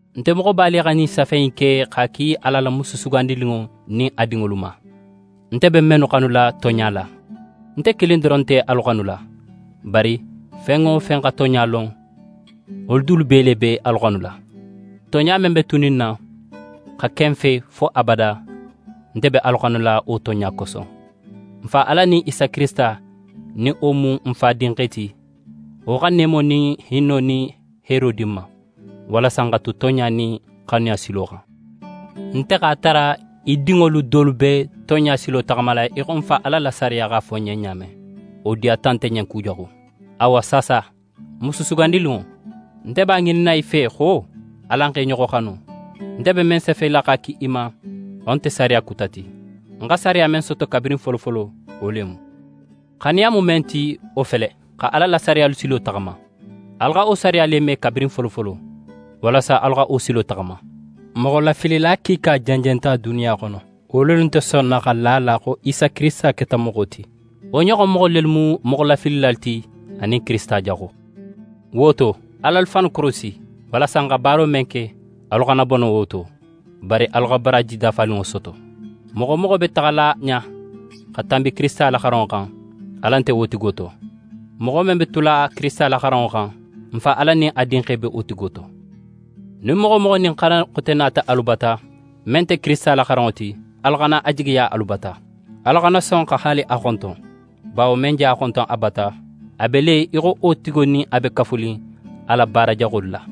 Nte Moxoba le xa ɲin safe in ke x'a ki Ala la Musu sugandininŋo nin a dinŋolu ma, nte be mennu xanula tonɲa la. Nte kilin doron nte alu xanula, bari fen wo fen xa tonɲa lon, wolu dulu bee le be alu xanula. Tonɲa men be tunin n na, xa ke n fe fo abada, nte be alu xanula wo tonɲa koso. N Fa Ala nin Isa Kirisita, nin wo mu n Fa Dinxe ti, wo xa neemo nin hinno nin heero di n ma, walasa n xa tu tonɲa nin xanuya silo xan. Nte x'a tara í dinŋolu dolu be tonɲa silo taxamala í xo n Fa Ala la sariya x'a fo n ɲen ɲa men. Wo diyata nte ɲen kujaxu. Awa saasa, Musu sugandininŋo, nte b'a ŋininna í fe xo: Alan x'e ɲoxo xanu. Nte be men safela x'a ki í ma, wo nte sariya kuta ti, n xa sariya men soto kabirin folofolo, wo le mu. Xanuya mu men ti, wo fele: Xa Ala la sariyalu silo taxama. Alu xa wo sariya le me kabirin folofolo, walasa alu xa wo silo taxama. Moxolafilila kiika jenjenta duniya xono, wo lelu nte sonna xa la a la xo Isa Kirisita keta moxo ti. Wo ɲoxon moxo le mu moxolafilila ti anin Kirisita Jaxo. Wo to, al'alu fannu korosi, walasa n xa baaro men ke, alu xana bono wo to, bari alu xa baraaji dafaninŋo soto. Moxo wo moxo be taxala ɲa xa tanbi Kirisita la xaranŋo xan, Ala nte wo tigo to. Moxo men be tula Kirisita la xaranŋo xan, n Fa Ala nin a Dinxe be wo tigo to. Nin moxo wo moxo nin xaran xote nata alu bata, men nte Kirisita la xaranŋo ti, alu xana a jigiya alu bata, alu xana son xa haali a xonton. Bawo men je a xonton a bata, a be le í xo wo nin a be kafunin a la baara jaxolu la.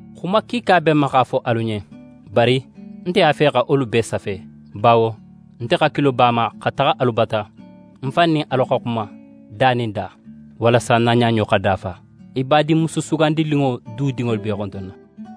Xuma kiika be ń ma x'a fo alu ɲen, bari ń nte a fe xa wolu bee safe. Bawo nte hakilo be a ma xa taxa alu bata, ń fan nin alu xa xuma da nin da, walasa n na ɲaɲo xa dafa. Í Badinmusu sugandininŋo du dinŋolu be í xontonna.